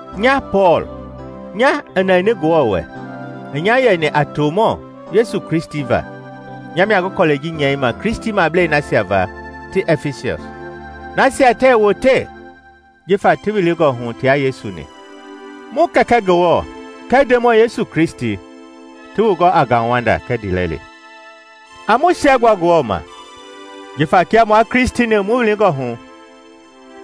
Nya Pɔɔl, nya i nɛni Ngewɔ wɛ i nya yɛni a tomɔ Yesu Kristi va, nya mia ngi kɔlɛi ji nyɛima Kristimablei nasia gama ti ɛfisɔs, nasia tɛɛ wote jifa ti wilingɔ hu tia Yesu-ni: Mu Kɛkɛ Ngewɔ kɛɛ Ndemɔi Yesu Kristi ti wu gɔ a ngauwanda kɛɛ ndiilɛli. A mu siɛgbua Ngewɔ ma jifa kia mua Kristi-ni mu wilingɔ hu,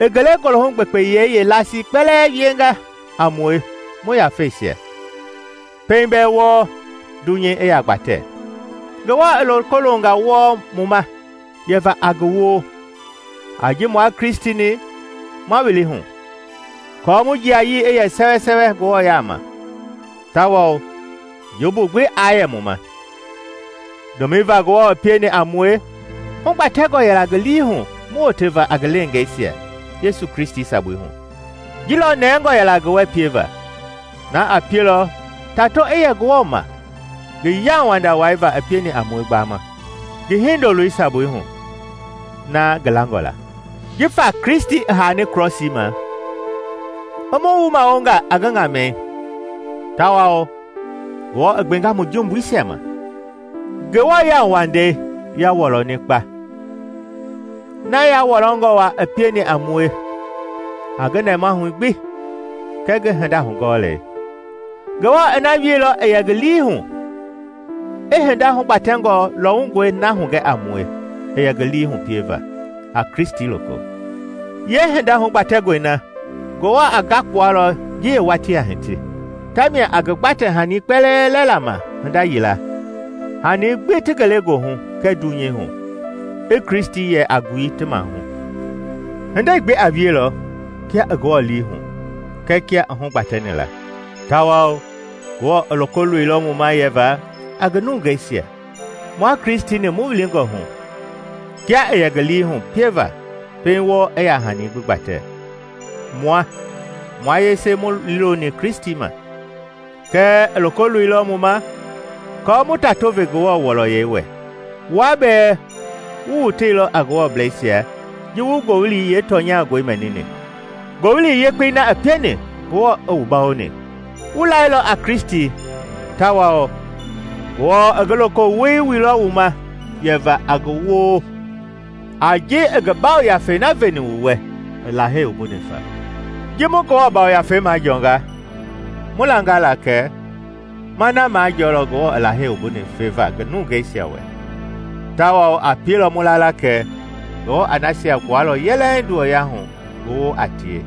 i ngelegoohu gbekpeyɛi yeelasii kpɛlɛɛ wienga a mue mu yafeisia. Pɛiŋ bɛɛ wɔɔ dunyei i yaa gbatɛ, Ngewɔ i loko longa wɔɔ mu ma yɛva a ngi woo, a ji mua Kristi-ni ma wili hu aako mu jiayii i yɛ sɛwɛsɛwɛ Ngewɔ yaama, tawao jumbu gbi aa yɛ mu ma. Ndomɛi va Ngewɔ pieni a mue, hugbatɛngɔ yɛla ngi lii hu mu woteva a ngi leengeisia Yesu Kristi sabui hu, ji lɔ nɛngɔ yɛla ngi wɛ pieva. Na a pielɔ tato i yɛ Ngewɔ ma ngi yauwanda wai va i pieni a mue gbaama, ngi Hindoloi sabui hu, na ngi langɔ la. Jifa Kristi i haani krɔsii ma, i mu wumawonga a ngi ŋamɛi tawao Ngewɔ i gbenga mu jumbuisia ma. Ngewɔ yauwandei ya wɔlɔni ma kpa; na ya wɔlɔngɔ wa i pieni a mue a ngi nɛmahu gbi kɛɛ ngi hinda hugɔɔlei. Ngewɔ i na wieilɔ i yɛ ngi lii hu, i hinda hugbatɛngɔ lɔwungɔi na hugɛ a mue i yɛ ngi lii hu pieva a Kristi loko. Yeehinda hugbatɛngɔi na Ngewɔ a ngakpua lɔ ji yeewatii a hiti, ta mia a ngi gbatɛ-hani kpɛlɛɛ lɛla ma hinda yila; hani gbi ti ngelegoohu kɛɛ dunyei hu, i Kristi yɛ a ngui ti mahu. Hindei gbi a wielɔ kia i Ngewɔ lii hu kɛɛ kia i hugbatɛni la; tawao Ngewɔ i loko loilɔ mu ma yɛva a ngi nungeisia, mua Kristi-ni mu wilingɔ hu kia i yɛ ngi lii hu pieva pɛiŋ wɔɔ i yaa hani gbi gbatɛ. Mua, mua yese mu liiloni Kristi ma. Kɛɛ i loko loilɔ mu ma aako mu tato ve Ngewɔ wɔlɔyei wɛ. Wua bɛɛ wu woteilɔ a Ngewɔbleisia ji wu ngowili yeetɔnyangɔi mɛnini, Ngowili Yekpei na i pieni Ngewɔ i wu bawoni. Wu lailɔ a Kristi tawao Ngewɔ i ngi lokowoi wuilɔ wu ma yɛva a ngi woo a ji i ngi Yafei na veni wu wɛ i Lahei wumbuni fa. Ji mu Ngewɔ Yafei majɔɔnga, mu langa la kɛ ma na majɔɔlɔ Ngewɔ i Lahei wumbuni feva ngi nungeisia wɛ, tawao a pielɔ mu la la kɛ Ngewɔ a nasia gbualɔ yɛlɛŋ nduwɔyahu ngi woo a tie.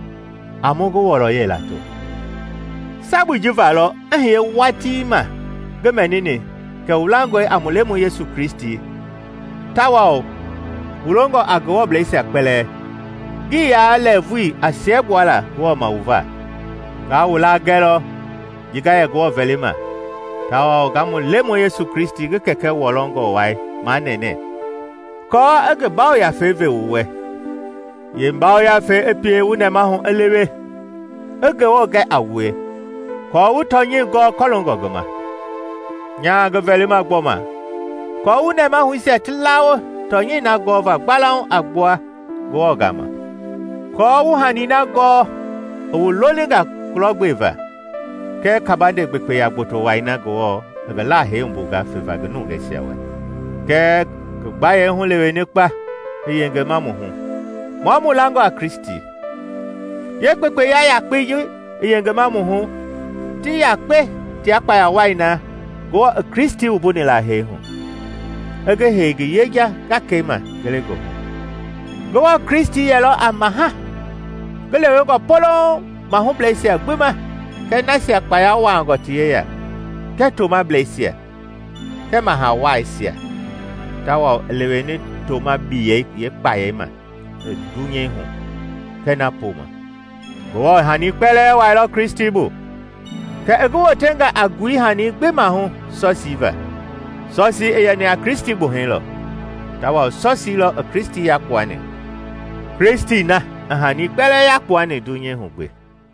A mu ngi wɔlɔyei lato! Sabui ji va lɔ i hiye watii ma ngi mɛnini kɛ wu langɔe a mu Lemɔi Yesu Kristi, tawao wu longɔ a Ngewɔbleisia kpɛlɛɛ, ngi yaa lɛɛvui a siɛgbuala Ngewɔ ma wu va. Nga wu laa gɛlɔ ji nga yɛ Ngewɔ vɛlima tawao nga mu Lemɔi Yesu Kristi ngi Kɛkɛ wɔlɔngɔ wai manɛnɛ aako i ngi Yafei ve wu wɛ, yee-Ngafei i pie wu nɛmahu i lewe, i Ngewɔ gɛ a wue, aako wu tɔnyɛi gɔɔ kɔloongɔ ngi ma. Nyaa ngi vɛlima gbɔma kɔɔ wu nɛmahuisia ti lawo tɔnyɛi na gɔva gbalauŋ a gbua Ngewɔ gama aako wu hani na gɔɔ i wu lolinga kulɔgbeva, kɛɛ kabande gbekpeya gboto wai na Ngewɔ i Lahei wumbunga feva ngi nungeisia wɛ, kɛɛ ngi gbayei huleweni kpa i yengema mu hu, mua mu langɔ a Kristi. Yeekpekpeya yakpei ji i yengema mu hu ti yakpe tia kpaya wai na Ngewɔ i Kristi wuni la hee hu, i ngi hei ngi yeja gakei ma ngelegoohu. Ngewɔ Kristi yɛlɔ a maha, ngi lewengɔ polouŋ mahubleisia gbi ma kɛɛ nasia kpaya wuangɔ ti yeya, kɛɛ tomableisia, kɛɛ mahawaisia tawao i leweni toma-biyɛi yeekpayei ma i dunyeihu kɛɛ na poma. Ngewɔ i hani kpɛlɛɛ wuailɔ Kristi bu, kɛ i ngi wotɛnga a ngui hani gbi mahu sɔsii va. Sɔsii i yɛni a Kristi gbuhɛi lɔ, tawao sɔsii lɔ i Kristi yakpuani, Kristi na i hani kpɛlɛɛ yakpuani dunyei hu gbi.